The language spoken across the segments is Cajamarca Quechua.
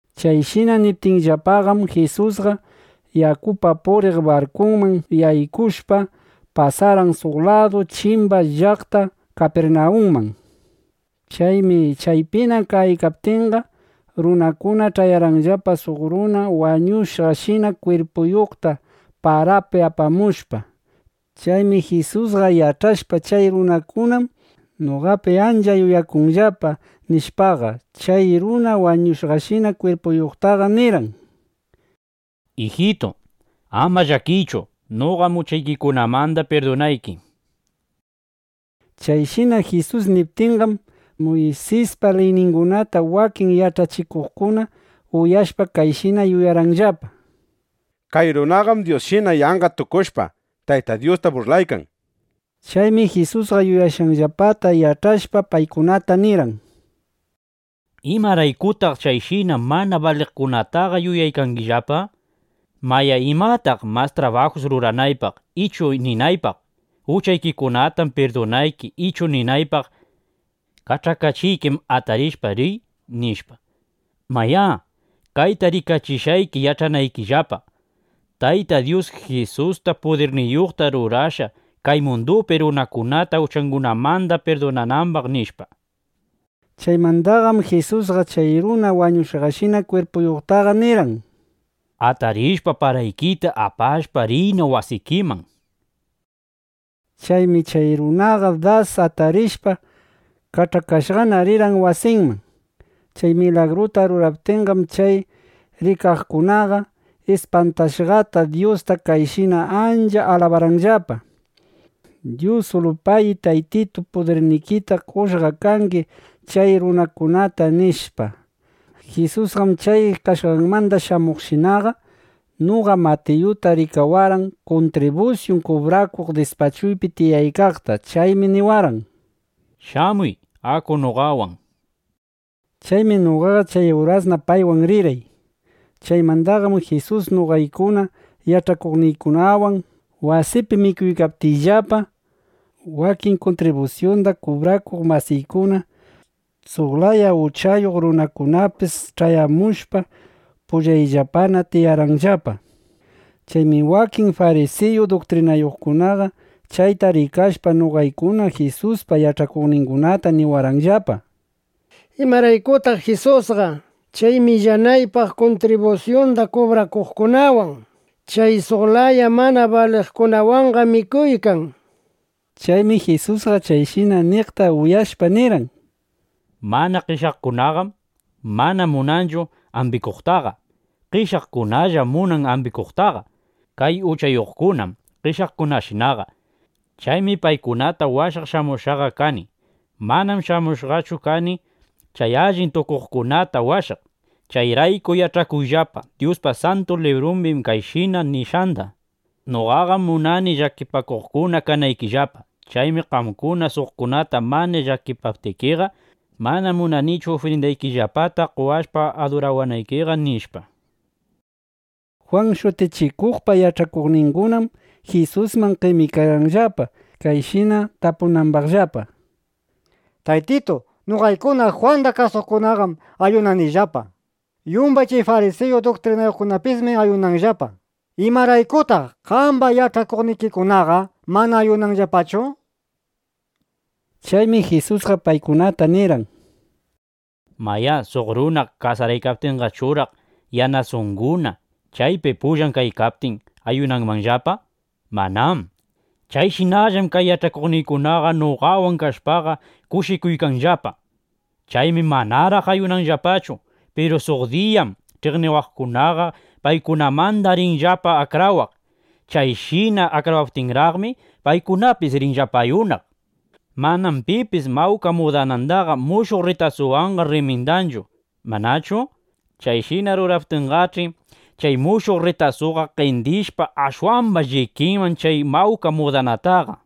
Chayshina niptinllapaqam, Jisusqa yakupi puriq barkuman yaykushpa, pasarqan suq ladu chimbaman llaqta Kapirnawunman. Chaymi chaypina kaykaptinqa, runakuna ch'ayarqanllapa suq runa wañushqashina kwirpuyuqta parapi apamushpa. Chaymi Jisusqa yach'ashpa: Chay runakunam noqapi ancha yuyakunllapa, nishpaqa, chay runa wañushqashina kwirpuyuqta nirqan: —Ijitu, ama llakiychu. Noqam uchaykikunamanda pirdunayki, nishpa. Chayshina Jisus niptinqam, Muysispa liyningunata wakin yach'achikuqkuna uyashpa, kayshina yuyarqanllapa: Kay runaqam Dyusshina yanqa tukushpa, Tayta Dyusta burlaykan, nishpa. Chaymi Jisusqa yuyashqanllapata yach'ashpa, paykunata nirqan: —¿Imaraykutaq chayshina mana baliqkunataqa yuyaykangillapa? Mayá, ¿imataq mas trabajus ruranaypaq, ichu ninaypaq: “Uchaykikunatam pirdunayki” ichu ninaypaq: “Kach'akachiykim; atarishpa, riy” nishpa? Mayá, kayta rikachishqayki yach'anaykillapa: Tayta Dyus Jisusta pudirniyuqta rurashqa, kay mundupi runakunata uchangunamanda pirdunanambaq, nishpa. Chaymandaqam Jisusqa chay runa wañushqashina kwirpuyuqtaqa nirqan: —Atarishpa, paraykita apashpa, riyna wasikiman, nishpa. Chaymi chay runaqa das atarishpa, kach'akashqana rirqan wasinman. Chay milagruta ruraptinqam, chay rikaqkunaqa ispantashqata Dyusta kayshina ancha alabarqanllapa: —Dyusilupagi, Taytitu, pudirnikitam qoshqa kangi chay runakunata, nishpa. Jisusqam chay kashqanmanda shamuqshinaqa, noqa Matiyuta rikawarqan kuntribusyun kubrakunay dispachuypi tiyaykaqta. Chaymi niwarqan: —Shamuy. Aku noqawan, nishpa. Chaymi noqaqa chay urasna paywan rirqay. Chaymandaqam Jisus noqaykuna yach'akuqningunawan wasiypi mikuykaptiyllapa, wakin kuntribusyunda kubrakuq masiykuna, suq laya uchayuq runakunapis ch'ayamushpa, pullayllapana tiyarqanllapa. Chaymi wakin farisiyu duktrinayuqkunaqa chayta rikashpa, noqaykuna Jisuspa yach'akuqningunata niwarqanllapa: —¿Imaraykutaq Jisusqa chay millanaypaq kuntribusyunda kubrakuqkunawan, chay suq laya mana baliqkunawanqa mikuykan? nishpa. Chaymi Jisusqa chayshina niqta uyashpaqa, nirqan: —Mana qeshyaqkunaqam mana munanchu ambikuqtaqa. Qeshyaqkunallam munan ambikuqtaqa. (Kay uchayuqkunam qeshyaqkunashinaqa.) Chaymi paykunata washaq shamushqaqa kani. Manam shamushqachu kani chay allin tukuqkunata washaq. Chayrayku yach'akuyllapa Dyuspa Santu Librumbi kayshina nishqanda: “Noqaqam munani llakipakuqkuna kanaykillapa. Chaymi qamkuna suqkunata mana llakipaptikiqa, mana munanichu ufrindaykillapata qowashpa adurawanaykiqa”, nishpa. Jwan Shutichikuqpa yach'akuqningunam Jisusman qemikarqanllapa, kayshina tapunambaqllapa: —Taytitu, noqaykuna Jwanda kasuqkunaqam ayunanillapa. Yumbay chay farisiyu duktrinayuqpismi ayunanllapa. ¿Imaraykutaq qamba yach'akuqnikikunaqa mana ayunanllapachu? nishpa. Chaymi Jisusqa paykunata nirqan: —Mayá, suq runa kasaraykaptinqachuraq, yanasunguna (yanasanguna) chaypi pullan kaykaptin, ¿ayunanmanllapa? Manám. Chayshinallam kay yach'akuqniykunaqa noqawan kashpaqa, kushikuykanllapa. Chaymi manaraq ayunanllapachu. Piru suq diyam (ch'iqniwaqkuna) paykunamanda rinllapa akrawaq. Chayshina akrawaptinraqmi, paykunapis rinllapa ayunaq. ’Manam pipis mawka mudanandaqa mushuq rritasuwanqa rrimindanchu, ¿manachu? Chayshina ruraptinqach'i, chay mushuq rritasuqa qendishpa, ashwamba llikinman chay mawka mudanataqa.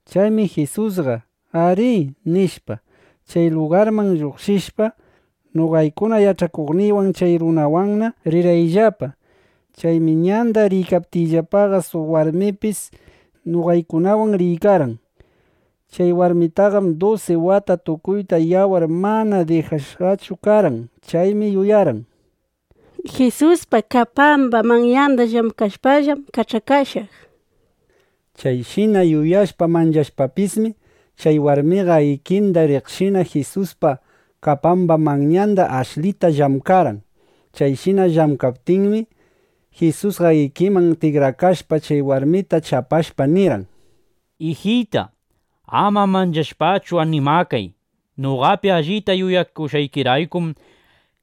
Chaymi Jisusqa “Arí”, nishpa, chay lugarmanda lluqshishpa, noqaykuna yach'akuqningunawan chay runawanna rirqayllapa. Chaymi ñanda riykaptiyllapaqa, suq warmipis noqaykunawan riykarqan. Chay warmitaqam dusi wata tukuyta yawar mana dijashqachu karqan. Chaymi yuyarqan: Jisuspa kapamba manyanda llamkashpallam kach'akashaq, nishpa. Chayshina yuyashpa, manchashpapismi, chay warmiqa ikinda riqshina Jisuspa kapamba manyanda ashlita llamkarqan. Chayshina llamkaptinmi, Jisusqa ikinman tikrakashpa, chay warmita chapashpa nirqan: —Ijita, ama manchashpachu, animakay. Noqapi allita yuyakushqaykiraykum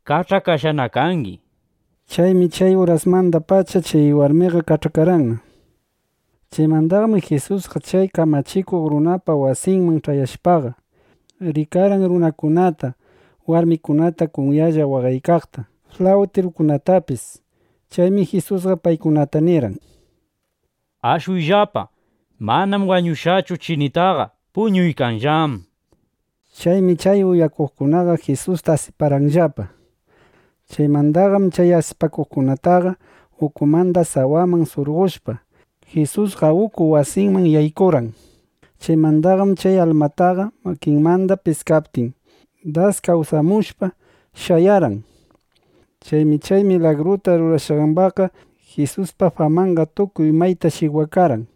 kach'akashqana kangi, nishpa. Chaymi chay urasmandapacha chay warmiqa kach'akarqanna. Chaymandaqam Jisusqa chay kamachikuq runapa wasinman ch'ayashpaqa, rikarqan runakunata, warmikunata kunyalla waqaykaqta, flawtirukunatapis. Chaymi Jisusqa paykunata nirqan: —Ashuyllapa. Manam wañushqachu chinitaqa. Puñuykanllám, nishpa. Chaymi chay uyaqkunaqa Jisusta asiparqanllapa. Chaymandaqam chay asipaqkunataqa ukumanda sawaman surqoshpa, Jisusqa uku wasiman yaykurqan. Chaymandaqam chay almataqa makinmanda piskaptin, das kawsamushpa, shayarqan. Chaymi chay milagruta rurashqambaqqa, Jisuspa famanqa tukuy mayta shikwakarqan.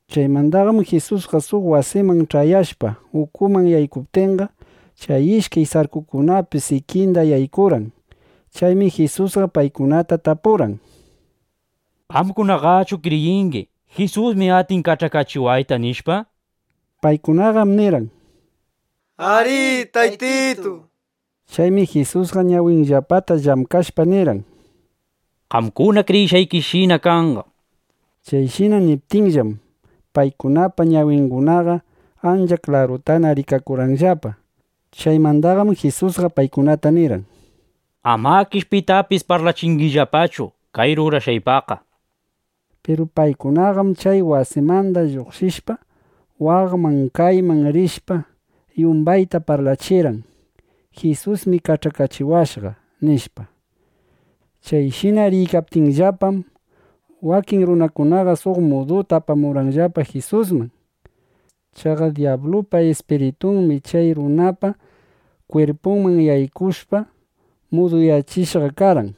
Chaymandaqam Jisusqa suq wasiman ch'ayashpa, ukuman yaykuptinqa, chay ishkay sarkukunapis ikinda yaykurqan. Chaymi Jisusqa paykunata tapurqan: —¿Qamkunaqachu kriyingi: Jisusmi atin kach'akachiwayta? nishpa. Paykunaqam nirqan: —Arí, Taytitu, nishpa. Chaymi Jisusqa ñawinllapata llamkashpa, nirqan: —Qamkuna kriyishqaykishina kanqa, nishpa. Chayshina niptinllam, paykunapa ñawingunaqa ancha klarutana rikakurqanllapa. Chaymandaqam Jisusqa paykunata nirqan: —Amakish pitapis parlachingillapachu kay rurashqaypaqqa, nishpa. Piru paykunaqam chay wasimanda lluqshishpa, waqman kaymanna rishpa, yumbayta parlachirqan: —Jisusmi kach'akachiwashqa, nishpa. Chayshina riykaptiyllapam, wakin runakunaqa suq muduta apamurqanllapa Jisusman. Chaqa dyablupa ispiritunmi chay runapa kwirpunman yaykushpa, muduyachishqa karqan.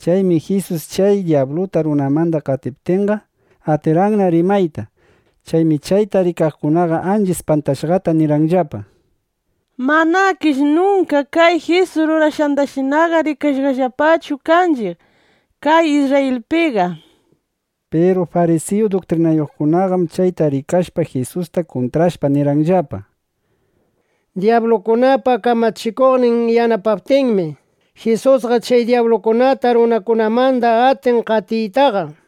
Chaymi Jisus chay dyabluta runamanda qatiptinqa, atirqanna rimayta. Chaymi chayta rikaqkuna ancha ispantashqata nirqanllapa: —¡Manakish nunka kay Jisus rurashqandashinaqa rikashqallapachu kanchiq kay Isrrayilpiqa! nishpa. Piru farisiyu duktrinayuqkunaqam chayta rikashpaqa, Jisusta kuntrashpa, nirqanllapa: —Dyablukunapa kamachikuqnin yanapaptinmi, Jisusqa chay dyablukunata runakunamanda atin qatiytaqa, nishpa.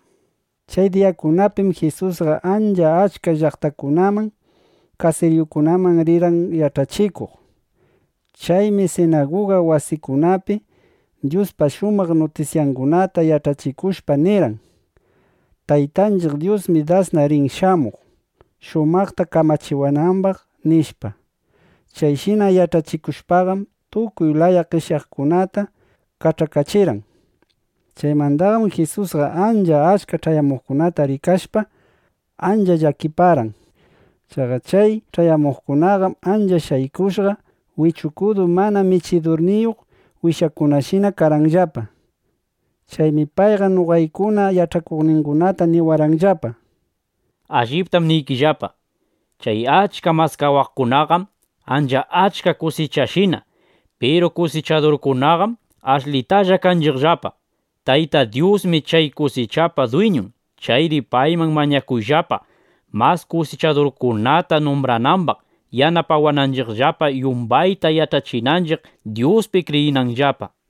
Chay diyakunapim Jisusqa ancha achka llaqtakunaman, kasiriyukunaman rirqan yach'achikuq. Chaymi sinaguga wasikunapi Dyuspa shumaq nutisyangunata yach'achikushpa, nirqan: —Taytanchiq Dyusmi dasna rin shamuq, shumaqta kamachikunambaq, nishpa. Chayshina yach'achikushpam, tukuy laya qeshyaqkunata kach'akachirqan. Chaymandaqam Jisusqa ancha achka ch'ayamuqkunata rikashpa, ancha llakiparqan. Chaqa chay ch'ayamuqkunaqam ancha shaykushqa, wichukudu mana michidurniyuq wishakunashina karqanllapa. Chaymi payqa noqaykuna yach'akuqningunata niwarqanllapa: —Alliptam niykillapa, chay achka maskawaqkunaqam ancha achka kusichashina. Piru kusichadurkunaqam ashlitalla kanchiqllapa. Tayta Dyusmi chay kusichapa dwiñun. Chayri payman mañakuyllapa, mas kusichadurkunata numbranambaq, yanapawananchiqllapa, yumbayta yach'achinanchiq, Dyuspi kriyinanllapa, nishpa.